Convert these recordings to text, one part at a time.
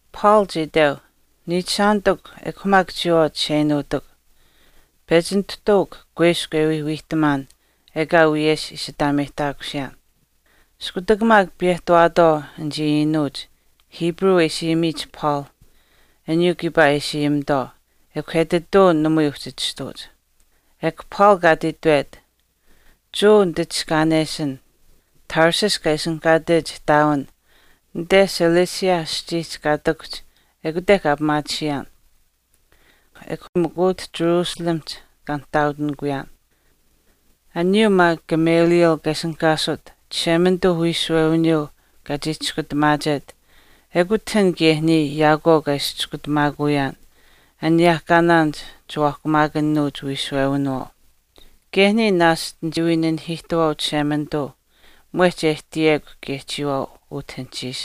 Paul chii iteu, “Niichishaanitikw ekw maak chiyawaau chisheinuutikw, pechi nituhtuukw kuiskw e wii wiihtamaan ekaa wiyesh ishi aataameyihtaakusiyaan.” Iskutak maak piyehtawaatwaau anichii iinuuch Hebrew e ishi ayimiyich Paul, aniyuu kiipaa e ishi ayimitwaau, ekw etituu namui uhchi chistuuch. Ekw Paul kaa ati itwet, “Jewa nititiskaanesin. Tarsus kaa ishinihkaatech ihtaawin anite Cilicia aschiihch kaa ihtakuhch ekute kaa pimaatisiyaan. Ekw mikw utah Jerusalemihch kaa nihtaautinikuyaan. Aniyuu maak Gamaliel kaa ishinihkaasut Chishemanituu uwiishuwewiniyuu kaa chii chiskutamaachet ekut an kaye niya yaakwaau kaa ishi chiskutamaakuyaan aniyehkaa chiwaahkumaakanuuch uwiishuwewinawaauh. Kaye niya naashch nichii wii nanihiihtuwaau Chishemanituu mwehch e ihtiyekw kaye chiyawaau utah anuhchiish.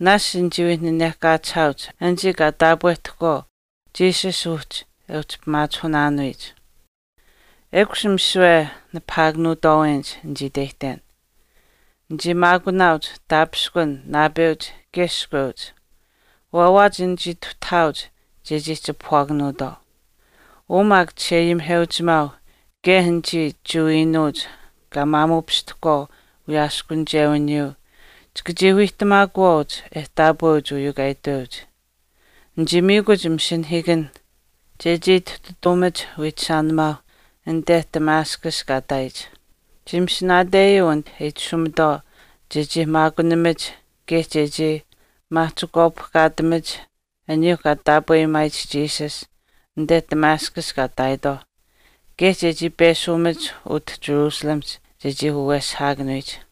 Naashch nichii wii nanehkaachihaauch anichii kaa taapwehtahkwaau Jesus uhchi e uhchi pimaachihunaanuuhch. Ekush misiwe nipahaakanuutwaawenich nichii iteyihten. Nichii maakunaauch taapishkun naapeuch kaye iskweuch, waawaach nichii ihtuutawaauch chechii chipahwaakanuutwaau. Uu maak chisheayimiheuchimaau kaye anichii Jewa iinuuch kaa maamuupishtahkwaau wiyaaskunichewiniyuu chika chii wiihtamaakuwaauch e taapweuch uyuu kaa itweuch. Nichii miikuch masinahiikanh chechii ituhtataamach wiichishaanimaauh anite Damascus kaa ihtaayich. Chii masinaateyuu anit e itashumitwaau chechii maakunimach kaye chechii maahchikwaapihkaatamach aniyuu kaa taapweyimaayich Jesus anite Damascus kaa ihtaayitwaauh kaye chechii peshiimach utah Jerusalemihch chechii waweshihaakanuyich.”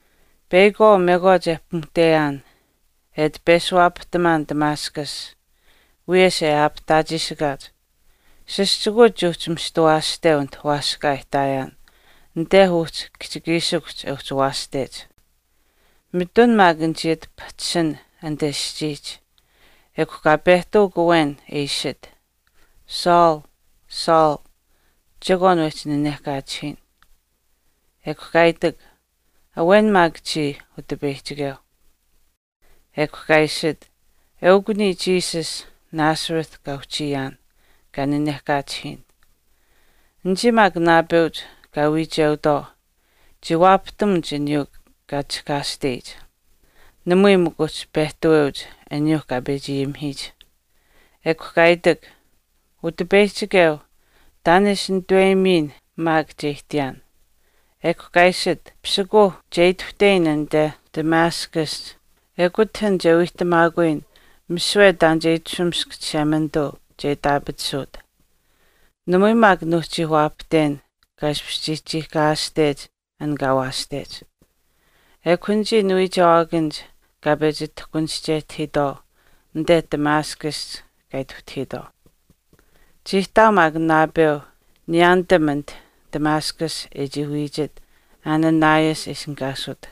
“Peyakwaau mekwaach e pimuhteyaan e ati peshuwaapahtamaan Damascus, wiyesh e aapihtaachiishikaach, sischikuuch chii uhchi mista waashteu anit waaskaa e ihtaayaan anite uhchi kihchikiishikuhch e uhchi waashtech. Mitun maak nichii ati pahchishin anite aschiihch ekw kaa pehtawak awen e iishit, ‘Saul, Saul chekwaan wehchi nanehkaachihiyin.’ Ekw kaa itak, ‘Awen maak chiya, Utipeyihchikeu.’ Ekw kaa iishit, ‘Eukw niya Jesus, Nazareth kaa uhchiyaan, kaa nanehkaachihiyin.’ Anichii maak naapeuch kaa wiicheutwaau chii waapahtamuch aniyuu kaa chihkaashteyich, namui mikw uhchi pehtaweuch aniyuu kaa pechi ayimihiyich. Ekw kaa itak, ‘Utipeyihchikeu, taan e ishi nituweyimiyin maak che ihtiyaan.’ Ekw kaa iishit, ‘Pisikuuh, che ituhteyin anite Damascusihch. Ekut an che wiihtamaakuyin misiwe taan e itashumisk Chishemanituu che itaapatisuut.’ Namui maak nuuhchii waapahten kaa ishpish chii chiihkaayaashtech an kaa waashtech. Ekw anichii niwiichewaakanich kaa pechi tahkunischehtahiitwaau anite Damascusihch kaa ituhtahiitwaau.” “Chii ihtaau maak naapeu niyaanitam anit Damascus e chii wiichit Ananias e ishinihkaasut.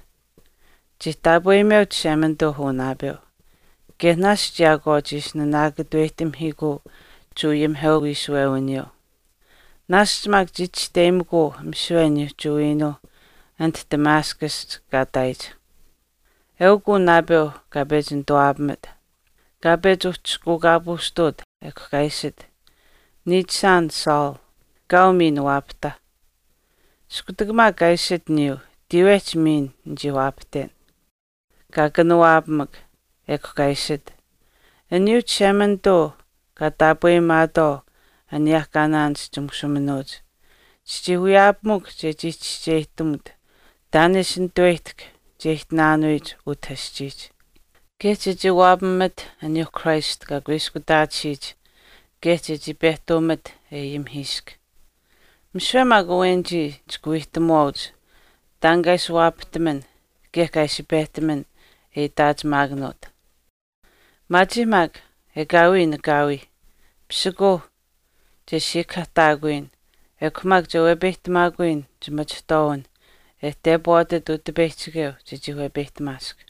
Chii taapweyimeu Chishemanituu uu naapeu kaye naashch yaakwaau chii ishi naanaakatuweyihtamihiikuu Jewa ayimihewiishuwewiniyuu. Naashch maak chii chisteyimikuu misiwe aniyuu Jewa iinuuh anit Damascusihch kaa ihtaayich. Eukw uu naapeu kaa pechi nituwaapamit, kaa pechi uhchishkuukaapuushtuut, ekw kaa iishit, ‘Niichishaan Saul, kaau miin waapahta.’ Iskutak maak kaa iishit aniyuu tiiwehch miin nichii waapahtamuwaan. Kaa kanawaapamak, ekw kaa iishit, ‘Aniyuuh Chishemanituu kaa taapweyimaatwaau aniyehkaanaanich chimushuuminuuch, chichii wiyaapamukw chechii chischeyihtamut taan e ishi nituweyihtahk che ihtinaanuyich utah aschiihch, kaye chechii waapamat aniyuu Christ kaa kuiskutaatisiyich kaye chechii pehtuumat e ayimihiisk. Misiwe maak awenichii chika wiihtamuwaauch taan kaa ishi waapahtaman kaye kaa ishi pehtaman e itaachimaakanuut. Maachiih maak, ekaawii nanakaawiih. Pisikuuh, che siikahaahtaakuyin, ekw maak che wepeyihtamaakuyin chimachihtwaawin e tepwaatat Utipeyihchikeu chechii wepeyihtamaask.’”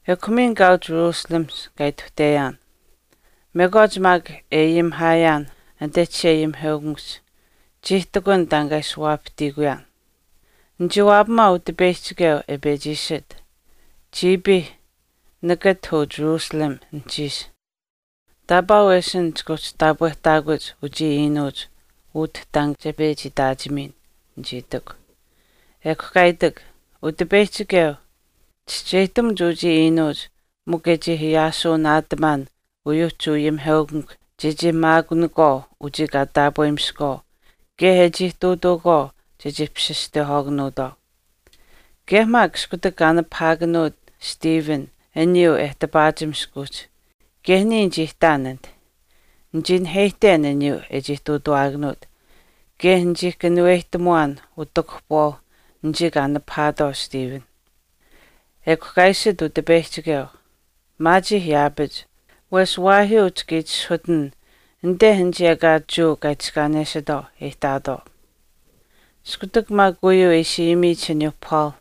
“Ekw miin kaau Jerusalemihch kaa ituhteyaan. Mekwaach maak e ayimihaayaan anite chisheayimiheukamikuhch, chii ihtakun taan kaa ishi waapahtiikuyaan. Nichii waapamaau Utipeyihchikeu e pechi iishit, ‘Chiipiih, nakat uu Jerusalem anuhchiish, taapaa wesin chika uhchi taapwehtaakuch uchii iinuuch utah taan che pechi itaachimiyin,’ nichii itikw. Ekw kaa itak, ‘Utipeyihchikeu, chischeyihtamuch uchii iinuuch mikw e chii ayaashuu naatamaan uyuu Jewa ayimiheukamikw chechii maakunakwaau uchii kaa taapweyimiskwaau kaye e chii ihtuutuukwaau chechii papasistehwaakanuutwaau. Kaye maak iskutak kaa nipahaakanuut Stephen aniyuu e tipaachimisk uhchi, kaye niya nichii ihtaan anit. Nichii naheyihten aniyuu e chii ihtuutawaakanuut kaye nichii kanuweyihtamuwaan utakuhpuwaau anichii kaa nipahaatwaau Stephen.’ Ekw kaa iishit Utipeyihchikeu, ‘Maachiih yaapach wesh waahyuu chika itishahuutin anite anichii ekaa Jewa kaa itiskaanesitwaau e ihtaatwaau.’” Iskutak maak uyuu e ishi ayimiyich aniyuuh Paul,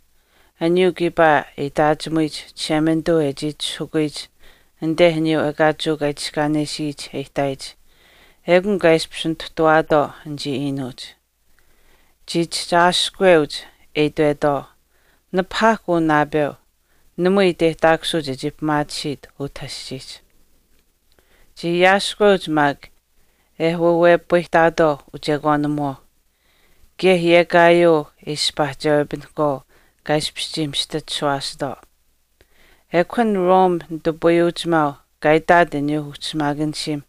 aniyuu kiipaa e itaachimuyich Chishemanituu e chii itishahukuyich anite aniyuu ekaa Jewa kaa itiskaanesiyich e ihtaayich, ekun kaa ishpish nituhtawaatwaau anichii iinuuch. Chii chihchi aashihkweuch e itwetwaau, “Nipahaahkw uu naapeu, namui iteyihtaakusuu chechii pimaatisiit utah aschiihch.” Chii aashihkweuch maak e waawepayihtaatwaau uchekwaanimuwaau, kaye yekaayuu e ishpaahchewepinahkwaau kaa ishpish chii mista chishuwaasitwaau. Ekw an Rome nitupayuuchimaau kaa itaat aniyuu ushimaakanishiim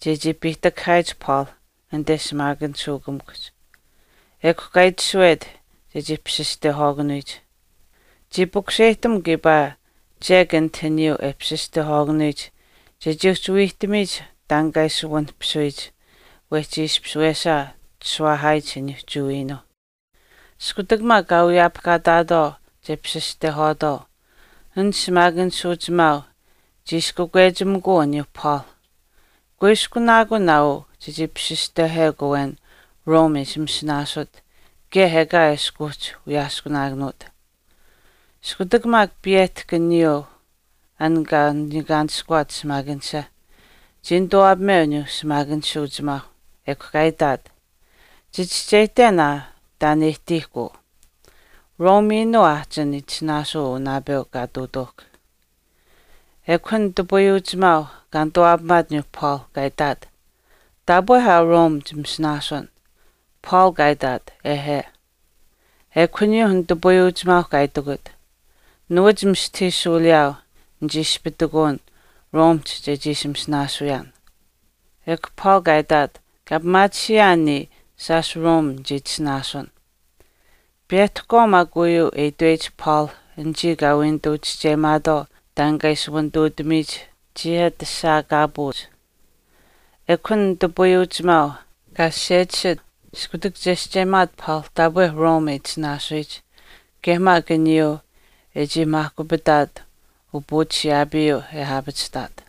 chechii piihtakahaayich Paul anite shimaakanishuukamikuhch. Ekw kaa itashuwet chechii papasistehwaakanuyich. Chii pukuseyihtam kiipaa chek anit aniyuu e papasistwehwaakanuyich chechii uhchi wiihtamiyich taan kaa ishi wanihpisuyich wehchi ishpish wesaa chishuwaahaayich aniyuu Jewa iinuuh. Iskutak maak kaa wiyaapihkaataatwaau che papasistehwaatwaau, an shimaakanishuuchimaau chii ishi kakwechimikuu aniyuu Paul, “Kuiskunaakun aa chechii papasistehwekw awen Rome e ishi masinaasut kaye ekaa eshkw uhchi wiyaaskunaakanuut.” Iskutak maak piyehtahk uyuu an kaa niikaanishkuwaat shimaakanisha, chii nituwaapameu aniyuu shimaakanishuuchimaau, ekw kaa itaat, “Chichischeyihten aa taan e ihtiihkw uu. Rome iinuu aahchin itisinaasuu uu naapeu kaa ihtuutuuhkw.” Ekw an nitupayuuchimaau kaa nituwaapamaat aniyuu Paul, kaa itaat, “Taapwe aa Rome chititasinaasun.” Paul kaa itaat, “Ehe.” Ekw aniyuu nitupayuuchimaau kaa itikut, “Nuwach mistahii shuuliyaau nichii ishpitikuun Romehch chechii ishi masinaasuyaan.” Ekw Paul kaa itaat, “Kaa pimaatisiyaan niya shaash Rome nichii itasinaasun.” Piyehtahkwaau maak uyuu e itweyich Paul anichii kaa wii nituu chischeyimaatwaau taan kaa ishi wanituutamiyich chii ati ashaakaapuuch. Ekw an nitupayuuchimaau kaa sasechisit iskutak chescheyimaat Paul taapwe Rome e itasinaasuyich, kaye maak aniyuu e chii maahkupitaat upuuchishiyaapiih e aapachihtaat.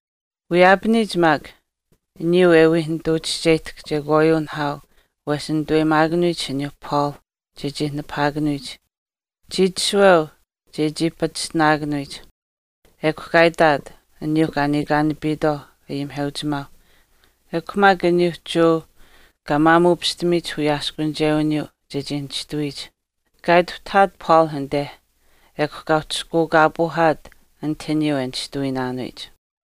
Wiyaapaniyich maak, aniyuu e wii nituu chischeyihtahk chekwaayuu nihaau wehchi nituweyimaakanuyich aniyuu Paul chechii nipahaakanuyich, chii itashuweu chechii pachishtinaakanuyich, ekw kaa itaat aniyuu kaa niikaanapiitwaau ayimiheuchimaauh ekw maak aniyuuh Jewa kaa maamuupishtamiyich wiyaaskunichewiniyuuh chechii nishtuwiyich. Kaa ituhtahaat Paul anite, ekw kaa uhchishkuukaapuuhaat anit aniyuu e nishtuwiinaanuyich.